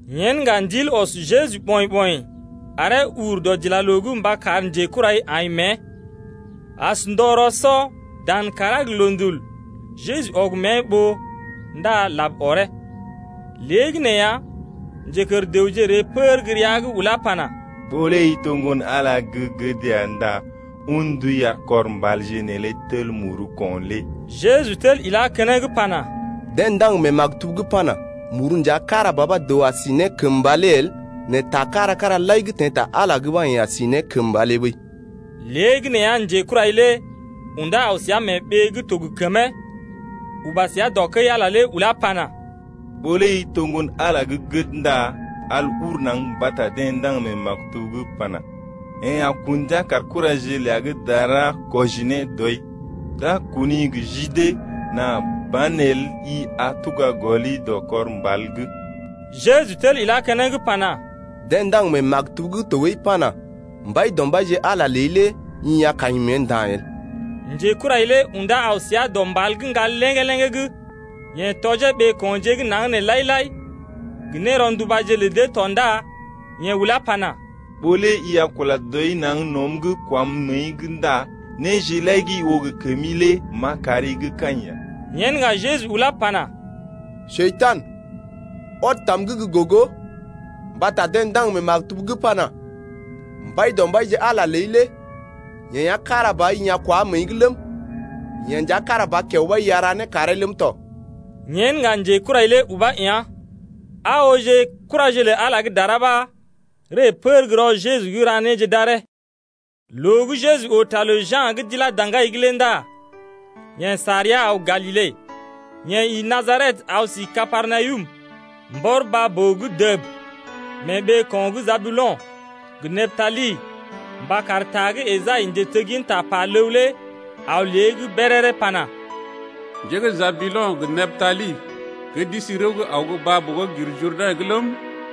Yen ŋga Ndil ɔs Jeju ɓɔḭ-ɓɔḭ aree ur dɔdilaloo’g mba kar njekurai aḭ mée. As ndɔ rɔ-sɔ, dan kàrá gə loondul’g, Jeju ɔg mée ɓoo ndá lab ɔree. Léegəneeya, njekər dəwje ree pər gə́ rəa’g ulá pana: Ɓó lé i to Ŋgon-Ala gə́ gəd ya ndá un ndui ar kɔr mbalje neelé tel muru ko̰ lé. Jeju tel ilá keneŋ pana: Deḛ ndaŋg mee maktub’g pana: Muru nja kára ba ɓa dəw a si ne kəmba lé el nɛ taje kára-kára lai gə́ teḛ ta Ala’g lé ɓa yeḛ a si ne kəmba lé ɓəi. Léegəneeya njekurai lé undá aw səa mee ɓee gə́ to gə kəmee, uba səa dɔ kəi-Ala ulá pana: Ɓó lé i to Ŋgon-Ala gə́ gəd ndá al ur naŋg mbata deḛ ndaŋg mee maktub’g pana: Yeḛ a kun ndia kar kuraje ləa gə́ dara kwɔji ne dɔi, D’a kuni gə ji dee Nà banelə i a tuga gɔli dɔ kɔr mbal’g. Jeju tel ilá keneŋ pana: Deḛ ndaŋg mee maktub’g tɔɓəi pana: Mbaidɔmbaije, Ala ləi lé i a kaḭ mée nda̰ el. Njekurai lé undá aw səa dɔ mbal gə́ ŋgal léŋgé-léŋgé’g. Yeḛ tɔjee ɓeeko̰je gə́ naŋg nee lai-lai gə néro̰dubaje lə dee tɔ ndá yeḛ ulá pana: Ɓó lé i a kunda barmba dəb kəmi naŋg nɔm’g ndá néje lai gə́ i oo gə kəmi neelé m’a kari gə́ kaḭ ya. Yen ŋga Jeju ulá pana: Njekurai, ɔd tam’g gə gogo mbata deḛ ndaŋg mee maktub’g pana: Mbaidɔmbaije Ala ləi lé yeḛ ya kára ba ɓa i a kunda barmba nea̰’g ləm, yeḛ nja kára ba kiao ɓa i a ra né karee ləm tɔ. Yen ŋga njekurai lé ubá yá̰. Aa ooje kuraje lə Ala gə́ dara ɓa ree pər gə́ rɔ Jeju’g ra néje d’aree tɔ. Loo gə́ Jeju oo ta lə Ja̰ gə́ d’ilá daŋgai’g lé ndá yeḛ sa rəa aw Galile. Yeḛ ḭ Najaret aw si Kapernawum mbɔr baa-boo’g dəb, mee ɓeeko̰ gə́ Jabulo̰ gə Neptali mba kar ta gə́ Esai, njetegginta pa ləw lé aw ne lée’g béréré pana: Njé gə́ Jabulo̰ gə Neptali Gə́ d’isi rəw gə́ aw gə́ baa-boo gə́ gir Jurdɛ̰’g ləm,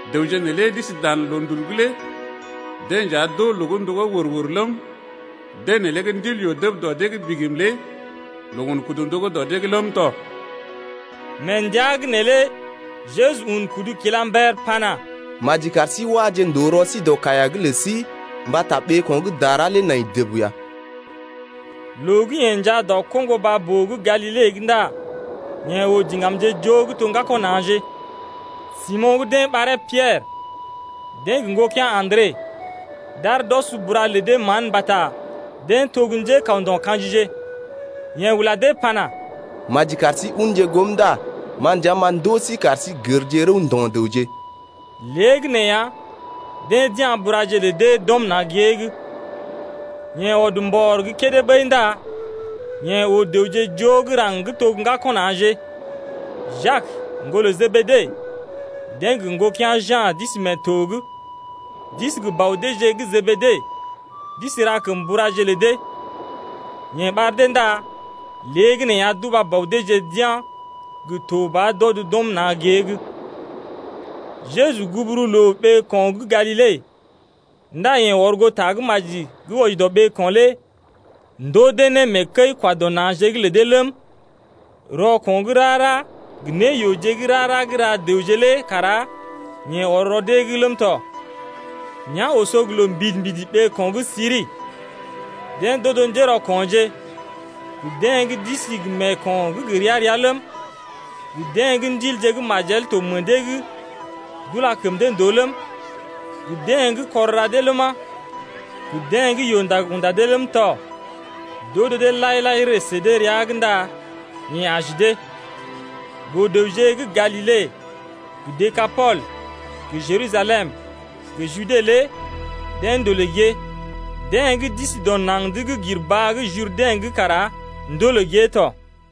Dəwje neelé gə́ d’isi dan loondul’g lé Deḛ nja d’oo loo gə́ ndogó wər-wər ləm, Deḛ neelé gə́ ndil yoo dəb dɔ dee’g bigim lé Loo un kudu ndogó dɔ dee’g ləm tɔ. Mee ndəa’g neelé Jeju un kudu kila mber pana: Maji kar sí waje ndòo rɔ sí dɔ kaiya’g lə sí mbata ɓeeko̰ gə́ dara lé nai dəb ya. Loo gə́ yeḛ njaa dɔ koŋgo baa-boo gə́ Galile’g ndá yeḛ oo diŋgamje joo gə́ to gə́ ŋgako̰ na̰je, Simo̰ gə́ deḛ ɓaree Piɛrə, deḛ gə ŋgokea̰ Andre, d’aar d’ɔs bura lə dee mán mbata deḛ to gə́ njékawndo̰ kajije. Yeḛ ula deḛ pana: Maji kar sí unje goom ndá ma nja m’a ndoo sí kar sí gərje rəw ndo̰ dəwje. Léegəneeya, deḛ d’ya̰ buraje lə dee d’ɔm na̰ gée’g. Yeḛ ɔd mbɔr gə́ kédé ɓəi ndá yeḛ oo dəwje joo gə́ raŋg gə́ to gə́ ŋgako̰ na̰je, Jak, ŋgolə Jebede, deḛ gə ŋgokea̰ Ja̰ d’isi mee to’g, d’isi gə bɔ deeje gə́ Jebede, d’isi ra kəm buraje lə dee. Yeḛ ɓar dee ndá léegəneeya d’uba bɔ deeje d’yá̰ gə to ɓa d’ɔd d’ɔm na̰ gée’g tɔ. Jeju gugu mee ɓeeko̰ gə́ Galile ndá yeḛ ɔr goo tagə́maji gə́ wɔji ne dɔ ɓeeko̰ lé ndoo dee ne mee kəi-kwa-dɔ-na̰je’g lə dee ləm, rɔko̰ gə́ rara gə néyooje gə́ rara gə́ ra dəwje lé kara yeḛ ɔr rɔ dee’g ləm tɔ. Nea̰ oso loo mbidi-mbidi ɓeeko̰ gə́ Siri. Deḛ d’odo njérɔko̰je, gə deḛ gə́ d’isi gə meeko̰ gə́ gə ria-ria ləm, gə deḛ gə́ ndilje gə́ majel to meḛ dee’g d’ula kəm dee ndòo ləm, gə deḛ gə́ kɔr ra dee ləma, gə deḛ gə́ yoo-ndag unda dee ləm tɔ, d’odo dee lai-lai ree sə dee rəa’g ndá yeḛ aji dee ya. Boo-dəwje gə́ Galile gə Dekapol gə Jerusalem gə Jude lé deḛ ndolè gée. Deḛ gə́ d’isi dɔ naŋg’d gə́ gir baa gə́ Jurdɛ̰’g kara ndolè gée tɔ.